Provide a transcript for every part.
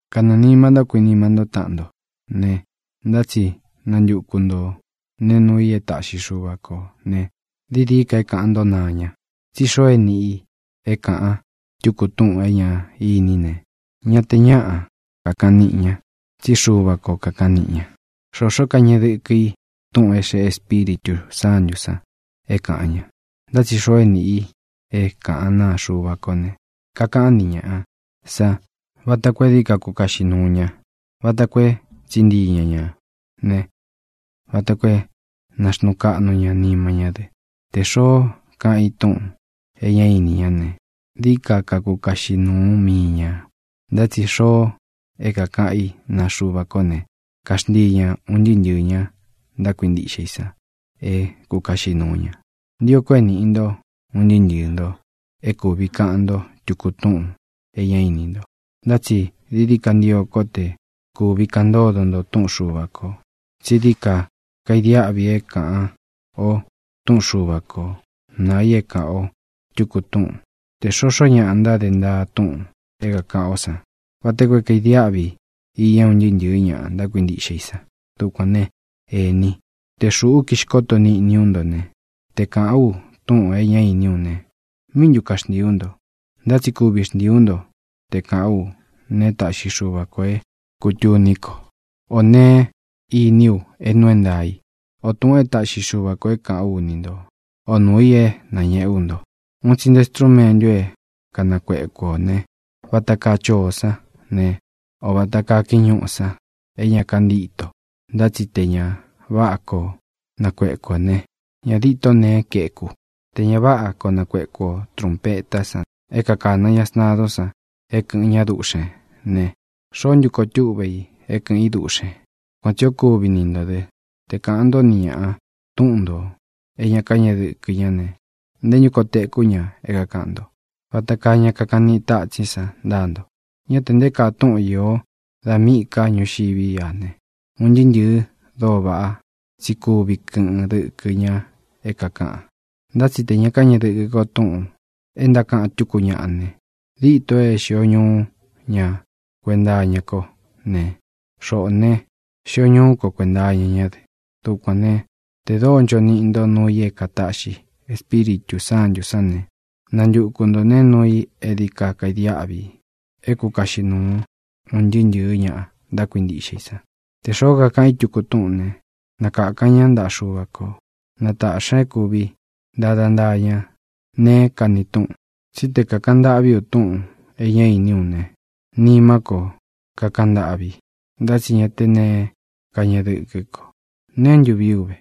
Kanɨɨ̄ nima ntó kuinima ntó taꞌan nto ne, ntá tsi nantuku nto nēe nuu i e táꞌxi Xuva kō ne, dií dií ka é kāꞌan ntó naa ña. Tsí xoo é nīꞌi i é kāꞌan tuku túꞌūn é ñá iní ne, ña te ñáꞌa kakaꞌan niꞌi ña, tsí Xuva ko kākaꞌan niꞌi ña. Xoxó kañeꞌe dɨkɨ i túꞌūn é xeꞌé Espíritū Sántū san é kāꞌan ña. Ntá tsi xoo é nīꞌi i é kāꞌán naa Xuva kó ne, kakaꞌán ni ñāꞌa san vata koo é dií ka kukaꞌxi nuu ña, vata koo é tsiꞌí ntii ña ñā ne, vata koo é nāxnuu kaꞌnu ña nima ñá dɨ. Tē xoó kaꞌan i túꞌūn e ñá ini ña ne, dií ka kakukaꞌxi nuu mii ña. Ntá tsi xoo é kākaꞌan i naa Xuva ko ne, kaxntii ña un ntɨɨ́ ntɨ̄ɨ ña ntákuintiꞌxe i san é kukaꞌxi nūu ña. Ntio ko é nīꞌi nto un ntɨɨ́ ntɨɨ̄ nto é kūvi kaꞌan nto tuku túꞌūn é ña íni nto. Ntá tsi dií dií ka ntio ko te kuvi kaꞌan ntódo nto túꞌun Xuva kō. Tsi dií ka kaidiáꞌvi é kāꞌan ó túꞌun Xuva ko nāa i é kāꞌan ó tuku túꞌun, tē xoxó ña ntada ntaa túꞌūn é kākaꞌan ó san, vata koo é kadiáꞌvi iña un ntɨɨ́ ntɨ̄ɨ ña ntákuintiꞌxe i san. Dukuān ne, ení, tē xuꞌú kixkoto níꞌni ú nto ne, te kāꞌán u túꞌūn é ña íni ú ne, ¿míꞌi ntu kaxntīi ú nto? Ntá tsi kuvi xntii ú nto te kāꞌán u neé taꞌxi Xuva ko é kūtuní ko, ō neé iní u é nuu é ntaā í, o tūꞌun é taꞌxi Xuva kō é kāꞌán u ni nto, o nūu i é nañēꞌe ú nto. Un tsi nte strúmentu é kanakueku ō ne, vata kaa choó san ne, o vata kaa kiñúꞌu san é ña kantíto, ntá tsi tē ña váꞌa koo nakueku ō ne, ña díto neé kaeku. Tē ña váꞌa koo nakuēku o trunpetá san é kākana ña sntadun san é kɨ̄ꞌɨn ñá duꞌxēn ne, ¿xoó ntu koo túꞌve i é kɨ̄ꞌɨn í duꞌxēn? Kuan tsī o kúvi ni ntō dɨ. Te kāꞌan ntó ni ñāꞌa túꞌun ntō é ña kañéꞌe dɨkɨ ñá ne, ¿nté ntu koo teku ña é kākaꞌan nto? ¡Vata kaa ña kakaꞌan niꞌi tátsín san ntáa nto! Ñá te nté kaa túꞌun īo da míꞌī ká ñuu ñuxiví a ne, un ntɨɨ́ ntɨ̄ɨ dóo váꞌa tsi kuvi kɨꞌɨn dɨkɨ ña é kākaꞌan. Ntá tsi tē ña káñeꞌe dɨkɨ ko túꞌūn é ntákaꞌan tuku ñaꞌa ne, díto é xio ñuu ña kuenta iña ko ne, xoꞌo né, xio ñuú ko kuēnta iña ñá dɨ. Dukuān ne, te dóo ncho niꞌi nto nuu i é kātaꞌxi Espíritū Sántū sán ne, nantuku ntō neé nuu i é dií ka kaidiáꞌvi i é kukaꞌxi nūu un ntɨɨ́ ntɨ̄ɨ́ ña ntákuintiꞌxe i san. Tē xoó kakaꞌan í tuku túꞌūn né, na kākan ñá ntaꞌa Xuva ko, na taꞌxī ña é kūvi ntada ntaa ñá neé kani túꞌun. Tsí te kākaꞌan ntâꞌví u túꞌūn e ñá ini ú ne, nimá ko kakaꞌan ntâꞌvi, ntá tsi ñá tē neé kañeꞌe dɨ́kɨ ko. ¿Neé ntu vii ú ve?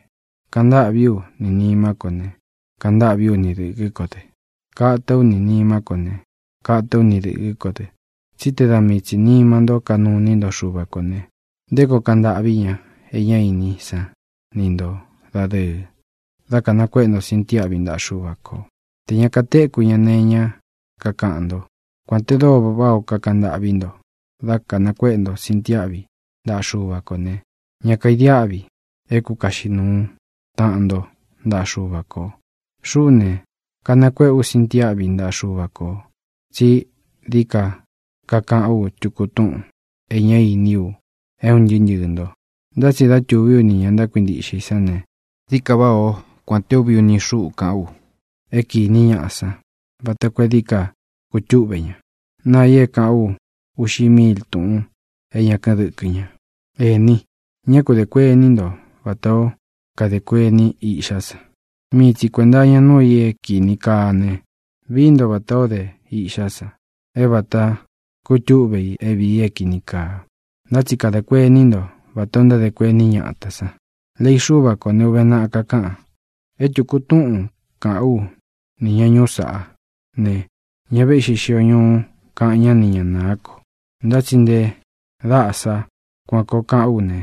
Kaꞌan ntâꞌví u ni nīmá ko ne, kaꞌan ntâꞌví u ni dɨ̄kɨ kó dɨ. Kata ú ni nīmá ko ne, kata ú ni dɨ̄kɨ kó dɨ. Tsí te da mii tsi nīma nto kanuu iní nto Xuva kō ne, ¿nté koo kaꞌan ntâꞌví ña é ñá iní san ni ntō dadɨɨ dá kanakuéꞌe nto sintiáꞌvi ntaꞌa Xuva ko, tē ña katéku ña nee iñá kakaꞌan nto? Kuān te dóo váꞌā ó kakaꞌan ntâꞌví nto dá kanakuéꞌe nto sintiáꞌvi ntaꞌa Xuva kō ne, ña kaidiáꞌvi é kukaꞌxi nuu taꞌan nto ntaꞌa Xuva kō. Xuꞌú ne, kanakuéꞌe ú sintiáꞌvi ntaꞌa Xuva kō tsí dií ka kakaꞌán u tuku túꞌūn é ña íni u é un ntɨɨ́ ntɨɨ̄ nto. Ntá tsi dá tūví u ni ñā ntákuintiꞌxe i sán ne, dií ka váꞌā ó kuān te úvi uni xúꞌu kaꞌán u é kīni ñaꞌa san vata koo é dií ka kutúꞌve ña, naa i é kaꞌán u uꞌxi míil túꞌūn é ña kɨ́ꞌɨn dɨkɨ ña. Ení, ñá ku dē kuení nto vatā ó kadē kuení iꞌxá san. Mii tsi kuēnta iña núu i é kīni kaa ne, vií nto vatā ó de iꞌxá san é vata kutúꞌve i é viī i é kīni kaa. Ntá tsi kadā kuení nto vatā o ntádē kuení ñatā san. Lei Xúva kō ne, uve naꞌa, kakaꞌan: “E tuku túꞌūn kaꞌán u ni ña ñūu sáꞌa, ne, ña véꞌxi xio ñuú kaꞌan ñá ni ña nāá ko, ntá tsi nte daꞌa sá kuān koo kaꞌán u ne,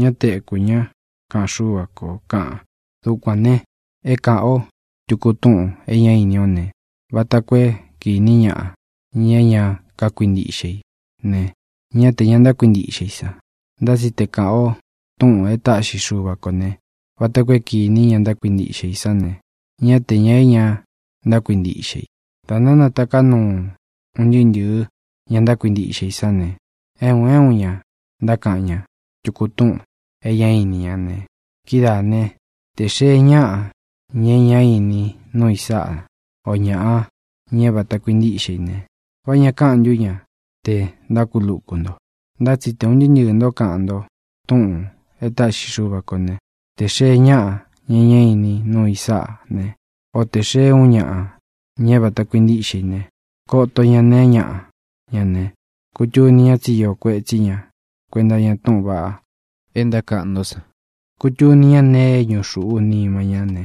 ña téku ña, kaꞌan Xúva kō”, kaꞌan. Dukuān ne, é kāꞌan ó tuku túꞌūn é ña íni ó ne, vata koo é kīní ñaꞌa, ña é ña kákuintiꞌxe i ne, ñá te ña ntákuintiꞌxe i san. Ntá tsi te kāꞌan o túꞌūn é tāꞌxi Xuva ko ne, vata koo é kīní ña ntákuintiꞌxe i san ne, ñá te ña é ña ntákuintiꞌxe i. Da ntánatāká nuu un ntɨɨ́ ntɨ̄ɨ ña ntákuintiꞌxe i sán ne, é un é un ña ntákaꞌan ña tuku túꞌūn é ña íni ña ne, kidáā ne, te xēe ñaꞌa, ña é ñá ini nuu i sáꞌa, o ñaꞌa, ña é vata kuintíꞌxe i ne, ¿vá ña kaꞌan ntú ña te ntákuluku nto? Ntá tsi te ūn ntɨɨ́ ntɨɨ̄ ntó kaꞌan nto túꞌūn e táꞌxi Xuva kō né, te xēe ñáꞌa, ña é ñá ini nuu i sáꞌa ne, o te xēe uun ñaꞌa, ña é vata kuintíꞌxe i ne, koto ña neé ñaꞌa ña ne, kūtuni ña tsí īo kuétsi ña kuēnta iña túꞌūn vaꞌa é ntákaꞌan nto san. Kutuni ña nee é ñuꞌu xūꞌu nima ña ne,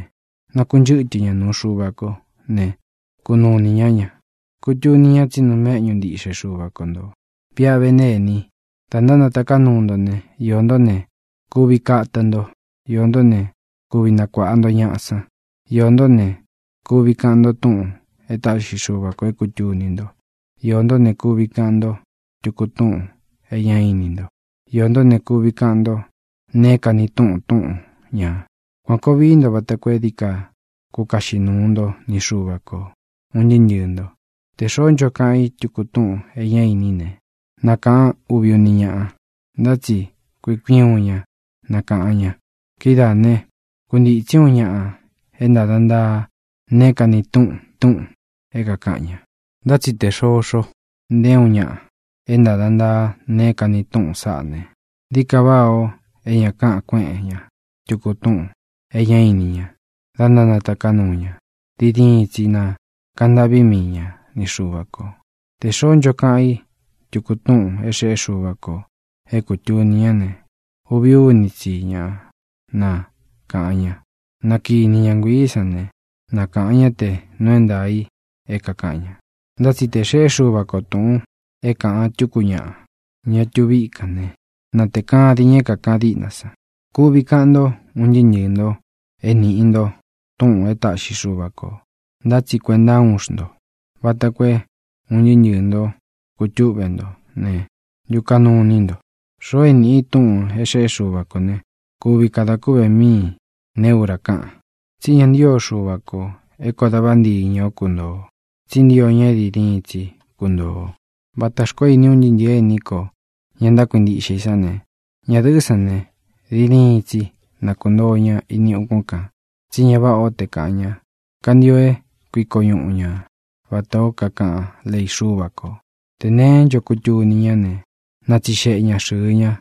nakunchɨ́tɨ ña nuu Xuva ko ne, kunuu ini ñá ña. Kutuni ña tsí nuu méꞌñu ntiꞌxe Xuva ko ntō. Viꞌa ve né, ení, dā ntánataká nuu nto ne, iō ntó ne, kuvi kata nto; iō ntó ne, kuvi nakuāꞌa nto ñaꞌa san; iō ntó ne, kuvi kaꞌan nto túꞌūn e táꞌxi Xuva kō é kūtuni nto; iō ntó ne, kuvi kaꞌan nto tuku túꞌūn é ña íni nto; iō ntó ne, kuvi kaꞌan nto neé kani túꞌun túꞌun ñā. Kuān koo vii nto vata koo é dií ka kukaꞌxi nuu nto ni Xuva kō, un ntɨɨ́ ntɨɨ̄ nto. Tē xoó ncho kaꞌan í tuku túꞌūn é ña íni í ne, na kāꞌan úvi uni ñáꞌa, ntá tsi kui kui uun ña na kāꞌan ña. Kidáā né, kuntītsí uun ña é ntāda ntaa neé kani túꞌun túꞌūn é kākaꞌan ña. Ntá tsi tē xoxo nté uun ña é ntada ntaa neé kani túꞌun sáꞌā ne, dií ka váꞌā o é ña káꞌan kueꞌen ña tuku túꞌūn é ña íni ña da ntánataká nuu ña. Diin diin tsi na kāꞌan ntâꞌví mii ña ni Xuva kō. Tē xoó ncho kaꞌan i túꞌūn é xeꞌé Xuva kō é kūtuni ñá ne, uvi úni tsi ña na kāꞌan ña. Na kīní ña nguiī sán ne, na kāꞌan ñá te nuu é ntaā i é kākaꞌan ña. Ntá tsi tē xeꞌé Xuva ko tūꞌun é kāꞌan túku ñaꞌa, ña tuvi íkān né, na tēe kádin ña é kākaꞌan díꞌna san. Kuvi kaꞌan nto, un ntɨɨ́ ntɨɨ̄ nto e níꞌi nto túꞌūn e táꞌxi Xuva kō, ntá tsi kuentá uun xntō, vata koo é un ntɨɨ́ ntɨɨ̄ nto kutúꞌve nto ne, ntukaꞌnu ini nto. Xoo é nīꞌi i túꞌūn é xeꞌé Xuva kō ne, kuvi kada kúꞌve míi neé ura káꞌan. Tsí ña ntio Xuva ko é kōo da vántiñɨ o kuntoo ō, tsí ntio ña é diin diin tsi kuntoo ō. Vatā xkoó ini un ntɨɨ́ ntɨ̄ɨ ení kō, ña ntákuintiꞌxe i sán ne, ñadɨ̄ꞌɨ́ san ne, diin diin tsi na kūntoo ña ini ukún kān, tsí ña váꞌā ó te kaꞌan ña. Kantio é kuiko ñuꞌu ña vatā ó kakaꞌán lei Xúva kō. Tē neé ncho kutuni ñá ne, na tsixeꞌe ña xɨɨ ña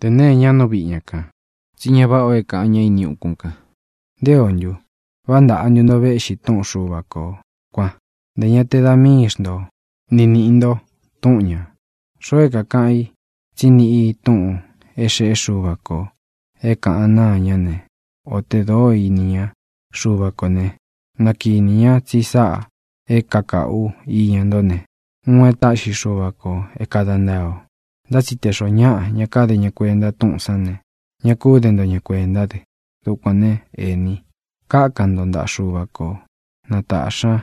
tē neé ña nú viꞌi ña kān. Tsí ña váꞌā o é kāꞌan ñá ini ukún kān. ¿Nté ō ntu? ¿Vá ntaꞌa ntú nto véꞌxi túꞌun Xuva kō kuan? Ntē ña te da míi xnto ni nīꞌi nto túꞌun ñā. Xoo é kākaꞌan i tsí niꞌi i túꞌūn é xeꞌé Xuva kō é kāꞌan náa ña ne, o tē dóo ini ña Xuva kō ne, na kīni ñá tsi sáꞌā é kakāꞌu ú iña ntó ne, uun e táꞌxi Xuva kō é kāda ntaa o. Ntá tsi tē xoó ñaꞌa ña káde ña kuenta túꞌūn sán ne, ña kú de nto ña kuentá dɨ. Dukuān ne, ení, kákan nto ntaꞌa Xuva ko na tāꞌxi ña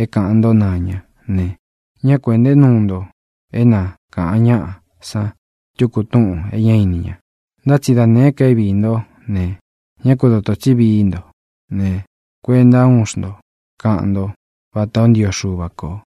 é kāꞌan ntó naa ña ne, ñá ku ēꞌnté nuu nto é na kāꞌan ñáꞌa san tuku túꞌūn é ña íni ña. Ntá tsi da nēé ka é viī ntó ne, ñá ku dotō tsí vií nto ne, kuentá uun xnto kaꞌan ntó vatā ó ntio Xuva kō.